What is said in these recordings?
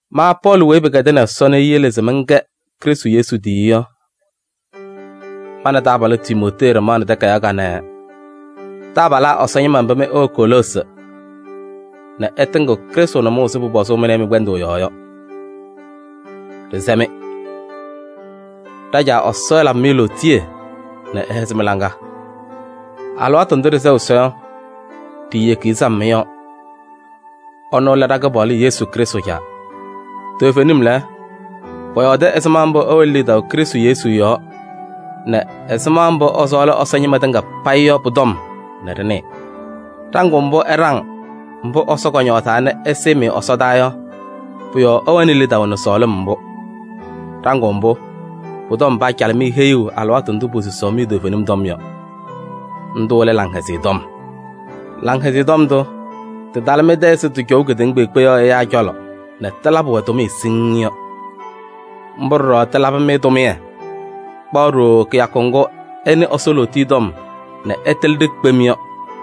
Ma Pɔɔlɩ weyi pɩkɛdɩnɩ Ɛsɔ nɛ eyele se mɛnkɛ Krɩstʋ Yesu tiyiyu yɔ, ma nɛ taabalʋ Timootee ɖɩmaɣnɩ takayaɣ kanɛ taabalaa Ɛsɔ ñɩma mba mɩ ɩwɛ Koloosi nɛ ɩtɩŋɩɣ Krɩstʋ nʋmɔʋ ɛzɩ pʋpɔzʋʋ mɩ nɛ ɩ mɩ-kpɛndʋʋ yɔɔ yɔ. Ɖɩsɛ-mɩ: ɖa-Caa Ɛsɔ ɛlabɩ-mɩ lootiye nɛ ɛhɛzɩ mɩ-laŋa! Alɩwaatʋ ndʋ ɖɩsɛɣ Ɛsɔ yɔ, ɖiiyeki-i sam mɩ-yɔɔ. Ɛnʋ lɛ ɖa-Kɩpaɣlʋ Yesu Krɩstʋ Caa. Toovenim lɛ, pɔyɔɔdɩ ɛzɩma mbʋ ɩwɛnɩ lidaʋ Krɩstʋ Yesu yɔɔ yɔ nɛ ɛzɩma mbʋ ɩsɔɔlɩ Ɛsɔ ñɩma tɩŋa payɩ yɔ pʋ-tɔm nɛ ɖɩnɩɩ. Ɖaŋʋʋ mbʋ ɩɖaŋ mbʋ Ɛsɔ kɔñɔɔzaa nɛ ɛsɩɩ-mɩ ɛsɔdaa yɔ, pʋ-yɔɔ ɩwɛnɩ lidaʋ nɛ sɔɔlɩm mbʋ. Ɖaŋʋʋ mbʋ, pʋ-tɔm paacalɩ-mɩ heyuu alɩwaatʋ ndʋ posusaɣ-mɩ toovenim tɔm yɔ. Ndʋ lɛ Laŋhɛzɩyɛ Tɔm. Laŋhɛzɩyɛ Tɔm ndʋ tɩtalɩ mɩ-tɛ ɛzɩ tɩcɔʋ kedeŋa kpeekpe yɔɔ ɛyaa cɔlɔ nɛ tɩlabɩ-wɛ tʋmɩyɛ siŋŋ yɔ. Mbʋ ɖɔɖɔ tɩlabɩ-mɩ tʋmɩyɛ kpaɣ ɖooo kɩyakʋ ŋgʋ ɩnɩ Ɛsɔ lootiye tɔm nɛ ɩtɩlɩ-ɖɩ kpem yɔ.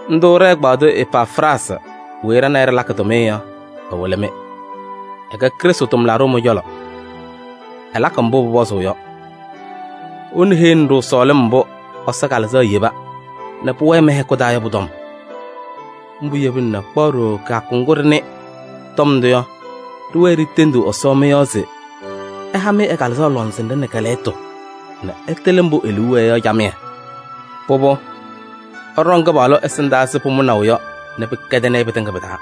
Ndʋ ɖɛ-ɛgbaadʋ Epafraasɩ weyi ɖa nɛ ɩ ɖɩlakɩ tʋmɩyɛ yɔ, ɛwɩlɩ-mɩ. Ɛkɛ Krɩstʋ tʋmlaɖʋ mɩ-cɔlɔ, ɛlakɩ mbʋ pʋpɔzʋʋ yɔ. Ɛnʋ heyini-ɖʋ sɔɔlɩm mbʋ Ɛsɔ Kalɩzaɣ yeba nɛ pʋwɛɛ mɩ-hɛkʋ taa yɔ pʋ-tɔm. Mbʋ yebina nɛ kpaɣ ɖooo kɩyakʋ ŋgʋ ɖɩnɩ tɔm ndʋ yɔ, ɖɩwɛɛ ɖitendiɣ Ɛsɔ mɩ-yɔɔ se ɛha-mɩ ɛ-Kalɩzaɣ lɔŋsɩnɖɛ nɛ kɛ-lɛɣtʋ nɛ ɩtɩlɩ mbʋ e-liu wɛɛ yɔ camɩyɛ. Pʋbʋ, ɩɖɔŋ Kɩpaɣlʋ ɛsɩndaa ɛzɩ pʋmʋnaʋ yɔ nɛ pɩkɛdɩnɩ-ɩ pɩtɩŋa pɩ-taa.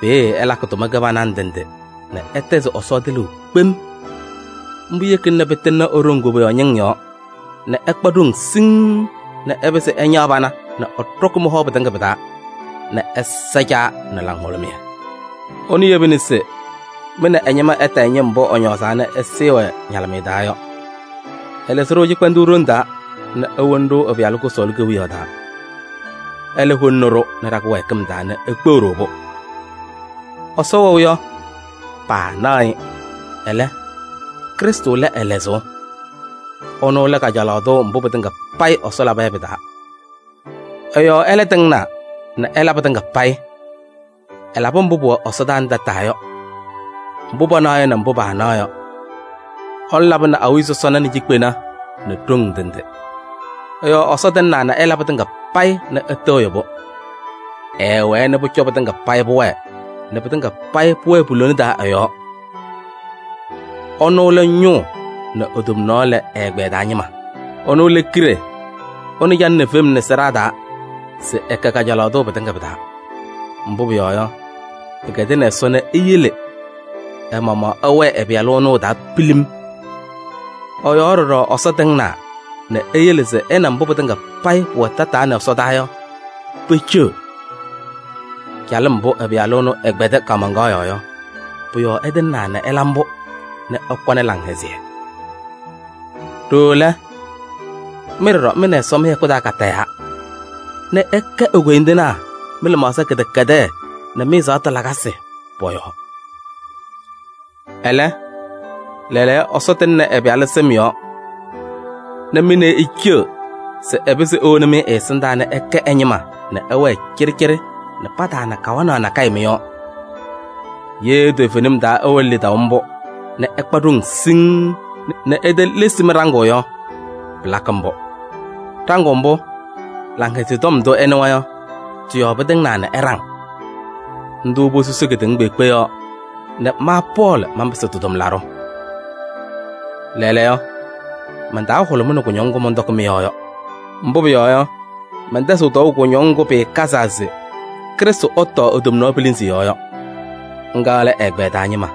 Peeye ɩlakɩ tʋma kɩbana ndɩ ndɩ nɛ ɩtɛzɩ Ɛsɔ tɩlʋʋ kpem. Mbʋ yekina nɛ pɩtɩŋnɩ e-ɖoŋ koboyaɣ ñɩŋ yɔɔ nɛ ɩkpa ɖoŋ siŋŋ nɛ ɩpɩzɩ ɩñaɣ pana nɛ ɩɖɔkɩ mɩ-hɔ pɩtɩŋa pɩ-taa nɛ ɩsa Caa nɛ laŋhʋlʋmɩyɛ. Ɛnʋ yebina se mɩ nɛ ɛ-ñɩma ɩtayɩ ñɩm mbʋ ɛñɔɔzaa nɛ ɛsɩɩ-wɛ ñalɩmɩyɛ taa yɔ. Ɛlɩzɩ-ɖʋ cɩkpɛndʋʋ ɖoŋ taa nɛ ewoni-ɖʋ ɛ-Pɩyalʋ kʋsɔɔlʋ kewiyaɣ taa. Ɛlɛ holini-ɖʋ nɛ ɖa-kɩwɛɛkɩm taa nɛ ekpeɣ-ɖʋ-pʋ. Ɛsɔ wɛʋ yɔ, paanaɣ-ɩ, ɛlɛ, Krɩstʋ lɛ ɛ-lɛzʋʋ. Ɛnʋ lɛ kajalaɣ tʋ mbʋ pɩtɩŋa payɩ Ɛsɔ laba yɔ pɩ-taa. Ɛ-yɔɔ ɛlɛ tɩŋnaa nɛ ɛla pɩtɩŋa payɩ. Ɛlabɩ mbʋ pʋwɛ ɛsɔdaa nɛ tataa yɔ, mbʋ panaɣ yɔ nɛ mbʋ paanaɣ yɔ. Ɛnʋ labɩnɩ awiya sɔsɔna nɛ cikpena nɛ ɖoŋ ndɩ ndɩ. Ɛ-yɔɔ Ɛsɔ tɩŋnaa nɛ ɛla pɩtɩŋa payɩ nɛ ɛtɩɣyɩ-pʋ. Ɛɛwɛɛ nɛ pʋcɔ pɩtɩŋa payɩ pʋwɛɛ nɛ pɩtɩŋa payɩ pʋwɛɛ pu-lona taa ɛ-yɔɔ. Ɛnʋ lɛ ñʋʋ nɛ e-tomnaɣ lɛ ɛ-ɛgbɛyɛ taa ñɩma. Ɛnʋ lɛ kiɖe, ɛnʋ calɩnɩ fem nɛ sɩɖaa taa se ɛkɛ kajalaɣ tʋ pɩtɩŋa pɩ-taa. Mbʋ pʋyɔɔ yɔ, pɩkɛdɩnɩ Ɛsɔ nɛ eyele ɛ-maɣmaɣ ɛwɛɛ ɛ-Pɩyalʋ ɛnʋ ɛ-taa pilim. Ɛ-yɔɔ ɖɔɖɔ Ɛsɔ tɩŋnaa nɛ eyele se ɛ nɛ mbʋ pɩtɩŋa pʋwɛ tataa nɛ ɛsɔdaa yɔ, peceɣ. Calɩm mbʋ ɛ-Pɩyalʋ ɛnʋ ɛkpɛdɩ kaamaŋkaɣ yɔɔ yɔ, pʋ-yɔɔ ɛtɩŋnaa nɛ ɛla mbʋ nɛ ɛkɔnɩ laŋhɛzɩyɛ. Ɖooo lɛ, mɩ ɖɔɖɔ mɩ nɛ Ɛsɔ mɩ-hɛkʋ taa katayaa nɛ ɩkɛ e-koyindinaa mɩ-lɩmaɣza kɩdɛkɛdɛɛ nɛ mɩ-ɛzaɣtʋ lakasɩ pɔ-yɔɔ. Ɛlɛ, lɛɛlɛɛyɔ Ɛsɔ tɩŋnɩ ɛ-Pɩyalʋ sɩm yɔɔ nɛ mɩ nɛ ɩ iceɣ se ɛpɩzɩ ewoni-mɩ ɛ-ɛsɩndaa nɛ ɩkɛ ɛ-ñɩma nɛ ɩwɛɛ cɩɖɩcɩɖɩ nɛ pataana kawanaɣ nakɛyɛ mɩ-yɔɔ. Ye toovenim taa ɩwɛnɩ lidaʋ mbʋ nɛ ɩkpa ɖoŋ siŋŋ nɛ itelesi mɩ-ɖaŋʋʋ yɔ, pɩlakɩ mbʋ. Ɖaŋʋʋ mbʋ, Laŋhɛzɩyɛ Tɔm ndʋ ɩnɩwa yɔ, tɩ-yɔɔ pɩtɩŋnaa nɛ ɩɖaŋ. Ndʋ posusi kedeŋa kpeekpe yɔɔ nɛ ma Pɔɔlɩ manpɩsɩ tɩ-tʋmlaɖʋ. Lɛɛlɛɛyɔ, man-taa hʋlʋmɩnɩ kʋñɔŋ ŋgʋ mɔntɔkɩ mɩ-yɔɔ yɔ. Mbʋ pʋyɔɔ yɔ, mɛntɛzɩɣ tɔɔʋ kʋñɔŋ ŋgʋ pɩɩkazaa se Krɩstʋ ɛtɔɔ e-tomnaɣ pilinzi yɔɔ yɔ. Ŋga lɛ ɛ-ɛgbɛyɛ taa ñɩma.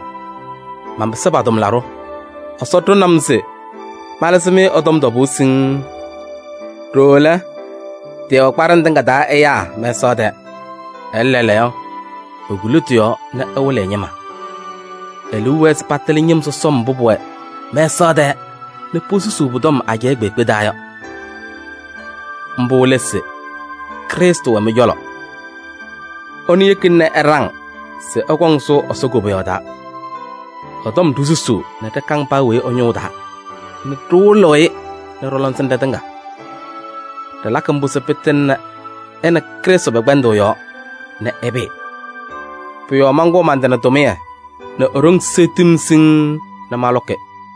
Manpɩsɩ pa-tʋmlaɖʋ: Ɛsɔ ɖʋnɩ-m se malɩzɩ-mɩ ɛ-tɔm tɔbʋʋ siŋŋ. Ɖooo lɛ, tɩɩwɛ kpaɖɩŋ tɩŋa taa ɛyaa mɛsaɣ tɛɛ, ɛlɛ lɛɛlɛɛyɔ, ekuli tɩ-yɔɔ nɛ ɛwɩlɩ ɛ-ñɩma. E-liu wɛɛ se patɩlɩ ñɩm sɔsɔm mbʋ pʋwɛ mɛsaɣ tɛɛ nɛ posusuu pʋ-tɔm ajɛɛ kpeekpe taa yɔ. Mbʋ lɛ se: Krɩstʋ wɛ mɩ-cɔlɔ. Ɛnʋ yekina nɛ ɩɖaŋ se ɩkɔŋ sʋʋ Ɛsɔ koboyaɣ taa. Ɛ-tɔm ɖisusuu nɛ ɖɩkaŋ paa weyi ɛ-ñʋʋ taa nɛ ɖɩwɩlɩɣ-ɩ nɛ ɖɔ-lɔŋsɩnɖɛ tɩŋa. Ɖɩlakɩ mbʋ se pɩtɩŋnɩ ɛ nɛ Krɩstʋ pɛ-kpɛndʋʋ yɔɔ nɛ ɛpɩɩ. Pʋ-yɔɔ mankʋʋ man-tɩ nɛ tʋmɩyɛ nɛ e-ɖoŋ seɣtiɣ-m siŋŋ nɛ malʋkɩ.